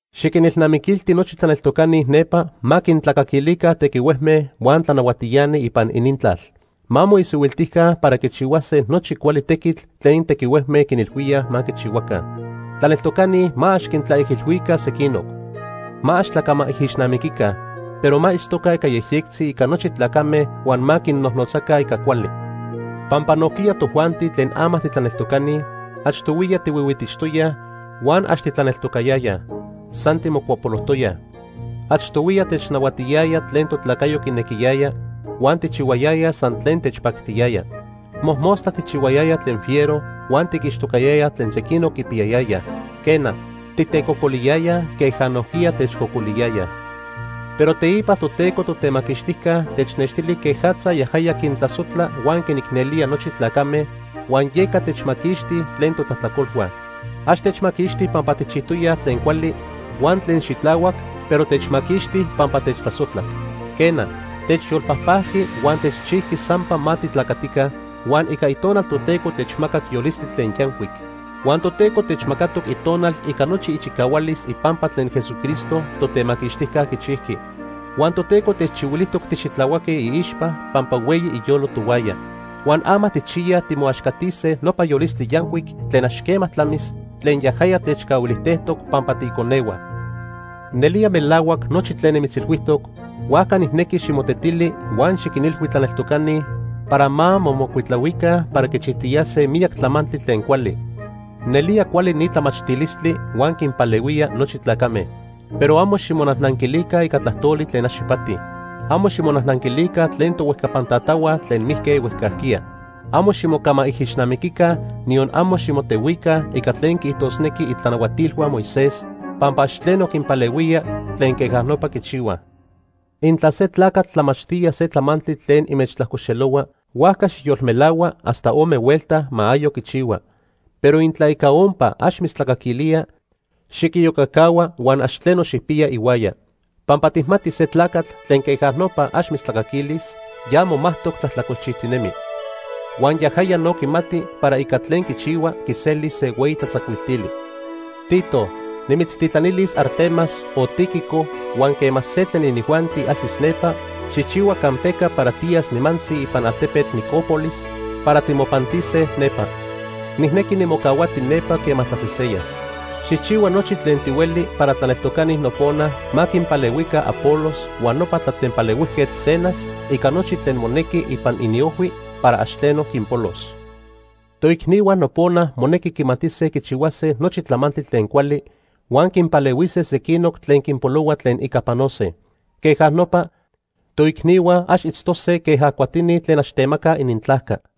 Xiquinilnamiquilti nochi tlaneltocani nepa ma quintlacaquilica tequihuejme huan tlanahuatiani ipan inintlal. Ma moisihuiltica para quichihuase nochi cuali tequitl tlen tequihuejme quinilhuíaj ma quichihuaca. Tlaneltocani ma ax quintlaijilhuica sequinoc. Ma ax tlacamaijixnamiquica, pero ma itztoca ica yejyectzi ica nochi tlacame huan ma quinnojnotzaca ica cuali. Pampa nojquiya tojuanti tlen ama titlaneltocani, achtohuiya tihuihuitixtoyaj huan ax titlaneltocayayaj. San timocuapolojtoyaj. Achtohuiya technahuatiyaya tlen totlacayo quinequiyaya, huan tijchihuayayaj san tlen techpactiyaya. Mojmostla tijchihuayayaj tlen fiero huan tiquixtocayayaj tlen sequinoc quipiyayayaj. Quena, titecocoliyayaj queja nojquiya techcocoliyayaj. Pero teipa Toteco Totemaquixtijca technextili quejatza yajaya quintlasojtla huan quinicnelía nochi tlacame, huan yeca techmaquixti tlen totlajtlacolhua. Ax techmaquixti pampa tijchijtoyaj tlen cuali huan tlen xitlahuac, pero techmaquixti pampa techtlasojtlac. Quena, techyolpajpajqui huan techchijqui sampa ma titlacatica, huan ica Itonal Toteco techmacac yolistli tlen yancuic. Huan Toteco techmacatoc Itonal ica nochi ichicahualis ipampa tlen Jesucristo, Totemaquixtijca, quichijqui. Huan Toteco techchihuilijtoc tixitlahuaque iixpa pampa hueyi iyolo tohuaya. Huan ama tijchiyaj timoaxcatise nopa yolistli yancuic tlen ax quema tlamis tlen yajaya techcahuilijtejtoc pampa tiiconehua. Nelía melahuac nochi tlen nimitzilhuijtoc, huajca nijnequi ximotetili huan xiquinilhui tlaneltocani para ma momocuitlahuica para quichijtiyase miyac tlamantli tlen cuali. Nelía cuali ni tlamachtilistli huan quinpalehuía nochi tlacame. Pero amo ximonajnanquilica ica tlajtoli tlen ax ipati. Amo ximonajnanquilica tlen tohuejcapantatahua tlen mijque huejcajquiya. Amo ximocamaijixnamiquica, niyon amo ximotehuica ica tlen quiijtosnequij itlanahuatilhua Moisés, pampa ax tleno quinpalehuía tlen queja nopa quichihuaj. Intla se tlacatl tlamachtía se tlamantli tlen inmechtlajcoxelohua, huajca xijyolmelahua hasta ome huelta ma ayoc quichihua. Pero intla ica ompa ax mitztlacaquilía, xiquiyocacahua huan ax tleno xijpiya ihuaya. Pampa tijmatij se tlacatl tlen queja nopa ax mitztlacaquilis, ya momajtoc tlajtlacolchijtinemi. Huan yajaya no quimati para ica tlen quichihua quiselis se hueyi tlatzacuiltili. Tito, nimitztitlanilis Artemas o Tíquico huan quema se tlen inijuanti ajsis nepa, xijchihua campeca para tiyas nimantzi ipan altepetl Nicópolis para timopantise nepa. Nijnequi nimocahuati nepa quema tlaseseyas. Xijchihua nochi tlen tihueli para tlaneltocani nopona ma quinpalehuica Apolos huan nopa tlatempalehuijquetl Zenas ica nochi tlen monequi ipan iniojhui para ax tleno quinpolos. Toicnihua nopona monequi quimatise quichihuase nochi tlamantli tlen cuali, huan quinpalehuise sequinoc tlen quinpolohua tlen ica panose. Queja nopa, toicnihua ax itztose queja cuatini tlen ax temacaj inintlajca.